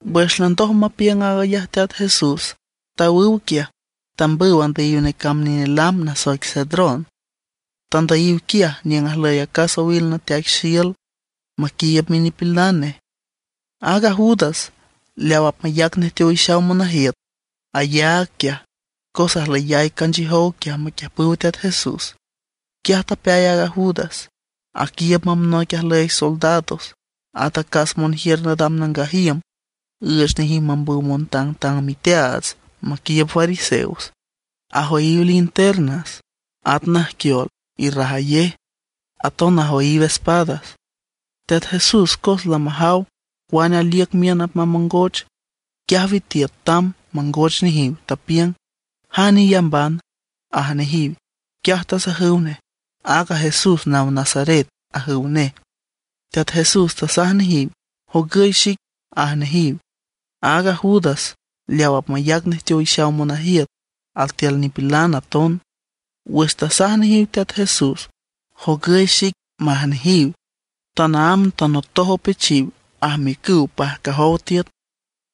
Wüx landoj mapiüng aag ayaj Teat Jesús, tawüw quiaj. Tambüw andüyiw necamb nine lam nasoic Cedrón. Tandüyiw quiaj niüng ajlüy acas owil nateaic xiül, maquiiüb minipilan nej. Aaga Judas, leaw apmayac nej teowixaw monajiüt, ayaag quiaj cos ajlüyay canchiüjow quiaj maquiüjpüw Teat Jesús. Quiaj tapeay aaga Judas, aquiiüb mamb noic ajlüy soldados, at acas monjiür nadam nangaj iüm, üüch nejiw mambüw montangtang miteaats maquiiüb fariseos. Ajoyiw linternas, at najquiol irrajayej; aton ajoyiw espadas. Teat Jesús cos lamajaw cuane aliüc miün apmamongoch, quiaj witiüt tamb mangoch nejiw. Tapiüng: ―¿Jane iyambana? ―aj nejiw. Quiaj tasajüw nej: ―Aaga Jesús naw Nazaret ―ajüw nej. Teat Jesús tasaj nejiw: ―Jogüy xic ―aj nejiw. Aaga Judas, leaw apmayac nej teowixaw monajiüt, altiül nipilan aton. Wüx tasaj nejiw Teat Jesús: “Jogüy xic”, maj nejiw, tanaámb tanotoj opechiw, ajmiücüw pajcajow tiüt.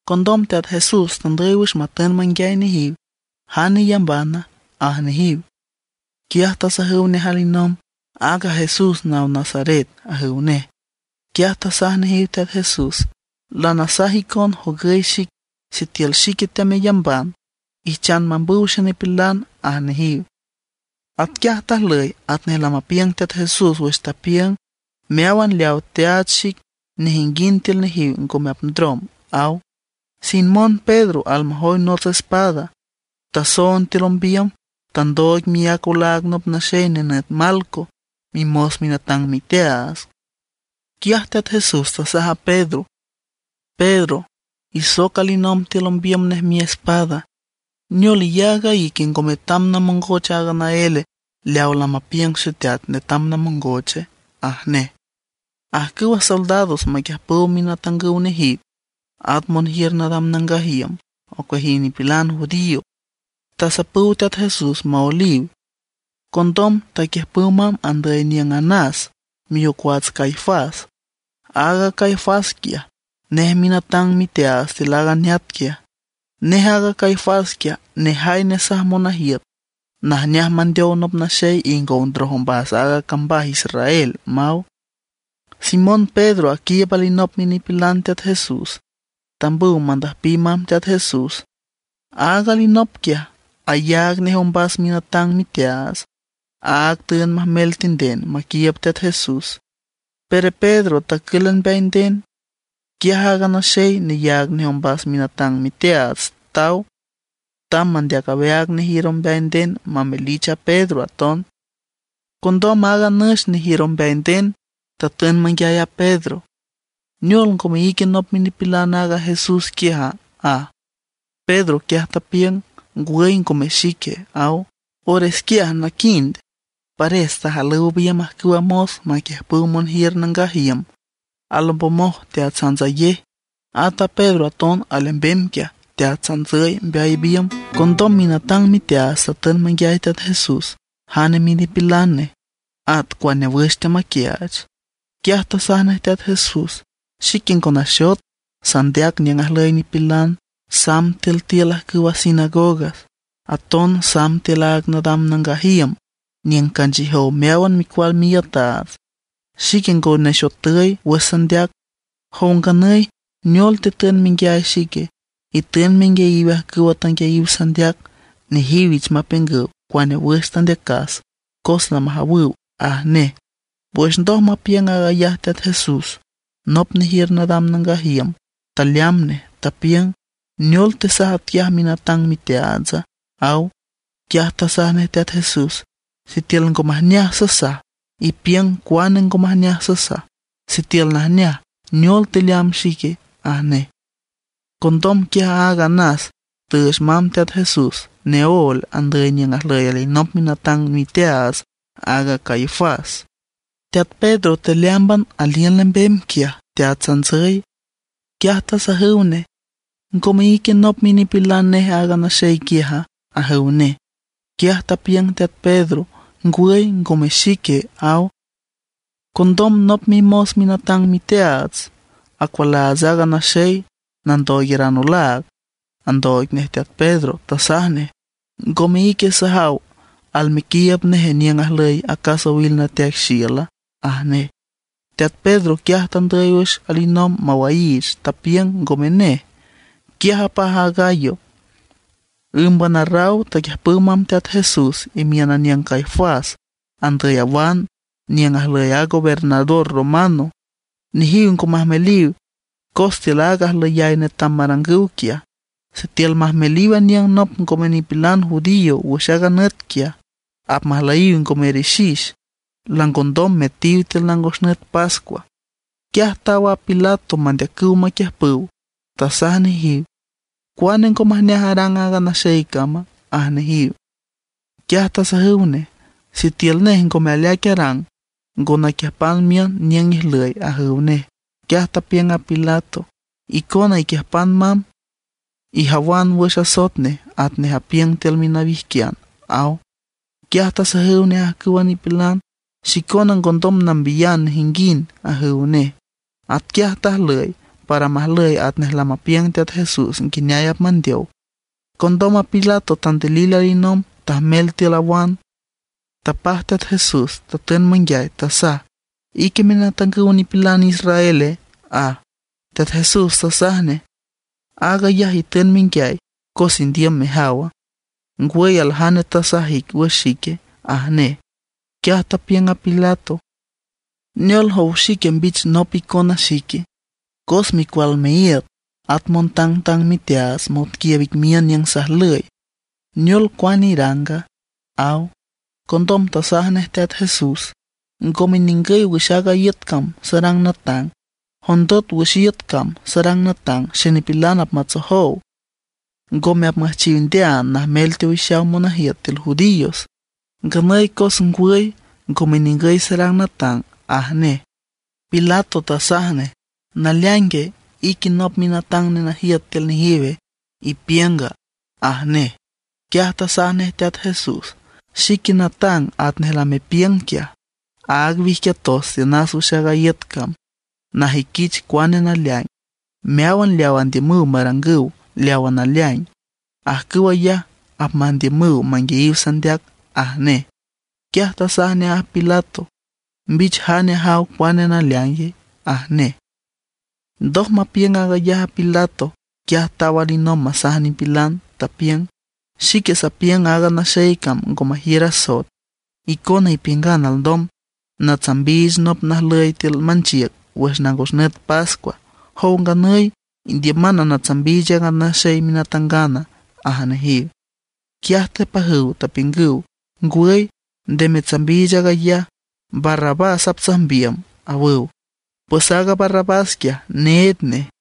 Condom Teat Jesús tandüy wüx matün manguiay nejiw: ―¿Jane iyambana? ―aj nejiw. Quiaj tasajüw nej alinomb: ―Aaga Jesús naw Nazaret ―ajüw nej. Quiaj tasaj nejiw Teat Jesús: ―Lanasaj icon jogüy xic. Sitiül xique temeyamban, ijchan mambüw xenipilan ―aj nejiw. Atquiaj tajlüy atnej lamapiüng Teat Jesús wüx tapiüng: “Meáwan leawa teaach xic, nejinguind tiül nejiw ngome apndrom”, aw. Simón Pedro almajoy nots espada, tasoond tiül ombiüm, tandooig miác olaag nop naxey nenüt Malco, mimos minatang miteaats. Quiaj Teat Jesús tasaj a Pedro: ―¡Pedro, isoc alinomb tiül ombiüm nej miespada! ¿Neol, iyaag a ique ngo metam namongoch aaga naél leaw lamapiüng Xeteat netam namongoche? ―aj nej. Ajcüwa soldados maquiüjpüw minatangüw nejiw, at monjiür nadam nangaj iüm ocueajiw nipilan judío, tasapüw Teat Jesús maoeliw. Condom taquiüjpüw mamb andüy aniüng Anás, miocuats Caifás. Aaga Caifás quiaj, nej minatang miteaats tiül aaga neat quiaj. Nej aaga Caifás quiaj, nejay nesaj monajiüt najneaj mandeow nop naxey ingow ndroj ombas aaga cambaj Israel, maw. Simón Pedro aquiiüb alinop minipilan Teat Jesús, tambüw mandüjpiw mamb Teat Jesús. Aaga alinop quiaj, ayaag nej ombas minatang miteaats. Áag tüünd majmel tinden maquiiüb Teat Jesús; pero Pedro tacǘlan mbeay nden. Quiaj aaga naxey neyaag nej ombas minatang miteaats taw, tamb mandeac aweaag nejiür ombeay nden mamelich a Pedro aton. Condom aaga nüx nejiür ombeay nden tatün manguiay a Pedro: ―¿Neol ngome ique nop minipilan aaga Jesús quiaja? ―aj. Pedro quiaj tapiüng: ―Ngwüy ngome xique ―aw. Ores quiaj naquind, pares tajalüw biümb ajcüwa mos maquiüjpüw monjiür nangaj iüm, alombomoj teatsantsayej. At a Pedro aton alembem quiaj teatsantsüy mbeay biümb. Condom minatang miteaats tatün manguiay Teat Jesús jane minipilan nej, at cuane wüx teamaquiaach. Quiaj tasaj nej Teat Jesús: ―Xique ngo naxot, sandeac niüng ajlüy nipilan; samb tiül tiül ajcüw a sinagogas, aton samb tiül aaga nadam nangaj iüm, niüng canchiüjow meáwan micual miiütaats. Xique ngo nexotüy wüx sandeac. ¿Jow nganüy, neol tetün menguiay xique? Itün menguiayiw ajcüwa tanguiayiw sandeac. Nejiw ich mapiüngüw cuane wüx tandeacas, cos lamajawüw ―aj nej. Wüx ndoj mapiüng aag ayaj Teat Jesús, nop nejiür nadam nangaj iüm taleamb nej, tapiüng: ―¿Neol tesaj atquiaj minatang miteaatsa? ―aw. Quiaj tasaj nej Teat Jesús: ―Sitiül ngo majneaj sasaj, ipiüng cuane ngo majneaj sasaj; sitiül najneaj, ¿neol teleamb xique? ―aj nej. Condom quiaj aaga Anás tüüch mamb Teat Jesús neóel, andüy niüng ajlüy alinop minatang miteaats, aaga Caifás. Teat Pedro tealeámban aliün lembem quiaj, teatsantsüy. Quiaj tasajüw nej: ―¿Ngome ique nop minipilan neje aaga naxey quiaja? ―ajüw nej. Quiaj tapiüng teat Pedro: ―Ngwüy, ngome xique ―aw. Condom nop mimos minatang miteaats, acualaats aaga naxey nandooigaran olaag, andooig nej teat Pedro, tasaj nej: ―¿Ngome ique sajaw almequiiüb nej niüng ajlüy acas owil nateaic xiüla? ―aj nej. Teat Pedro quiaj tandüy wüx alinomb mawaiich, tapiüng ngome nej. Quiaj apaj a gallo. Ǘmban arraw taquiüjpüw mamb Teat Jesús imiün aniüng a Caifás andüy awan niüng ajlüy a gobernador romano. Nejiw ngo majmeliw cos tiül aaga ajlüyay netam marangüw quiaj, sitiül majmeliw aniüng nop ngome nipilan judío wüx aaga nüt quiaj, apmajlüyiw ngo merixix, langondom metiw tiül nangos nüt pascua. Quiaj taw a Pilato mandeacüw maquiüjpüw, tasaj nejiw: ―¿Cuane ngo majneaj arang aaga naxey cama? ―aj nejiw. Quiaj tasajüw nej: ―Sitiül nej ngome aleaic arang ngo naquiüjpan miün niüng ijlüy ―ajüw nej. Quiaj tapiüng a Pilato: ―Icona iquiüjpan mamb, ijawan wüx asoet nej atnej apiüng tiül minawijquian ―aw. Quiaj tasajüw nej ajcüwa nipilan: ―Xicona ngondom nambiyan nejinguind ―ajüw nej. Atquiaj tajlüy para majlüy atnej lamapiüng Teat Jesús nguineay apmandeow. Condom a Pilato tandilil alinomb tajmel tiül awan, tapaj Teat Jesús matün manguiay, tasaj: ―¿Ique minatangüw nipilan israele? ―aj. Teat Jesús tasaj nej: ―¿Aag ayaj itün menguiay cos indiüm mejawa, ngwüy aljane tasaj ic wüx xique? ―aj nej. Quiaj tapiüng a Pilato: ―¿Neol jow xique mbich nop icona xique? Cos micual miíüt at montangtang miteaats monquiiüb ic miün niüng sajlüy. ¿Neol, cuane iranga? ―aw. Condom tasaj nej Teat Jesús: ―Ngome ningüy wüx aaga iüt cam sarang natang. Jondot wüx aaga iüt cam sarang natang xenipilan apmatsojow; ngome apmüjchiw ndeaan najmel teowixaw monajiüt tiül judíos. Nganüy cos ngwüy, ngome ningüy sarang natang ―aj nej. Pilato tasaj nej: ―¿Naleaingue, ique nop minatang nenajiüt tiül nejiw ipiünga? ―aj nej. Quiaj tasaj nej Teat Jesús: ―Xique natang atnej lamepiüng quiaj. Áag wijquiatos tiünas wüx aaga iüt cam najüiquich cuane naleaing. Meáwan leawa andiümüw marangüw leawa naleaing, ajcüw ayaj apmandiümüw manguiayiw sandeac ―aj nej. Quiaj tasaj nej a Pilato: ―¡Mbich jane ajaw cuane naleaing! ―aj nej. Ndoj mapiüng aag ayaj a Pilato, quiaj taw alinomb masaj nipilan, tapiüng: ―Xique sapiüng aaga naxey cam ngo majiür asoet. Icona ipiüngan alndom natsambiich nop najlüy tiül manchiüc wüx nangos nüt pascua. ¿Jow nganüy, indiüman natsambiich aaga naxey minatangana? ―aj nejiw. Quiaj tepajüw tapiüngüw: ―¡Ngwüy, nde metsambiich aag ayaj! ¡Barrabás aptsajmbiüm! ―awüw. Pues aaga Barrabás quiaj, need nej.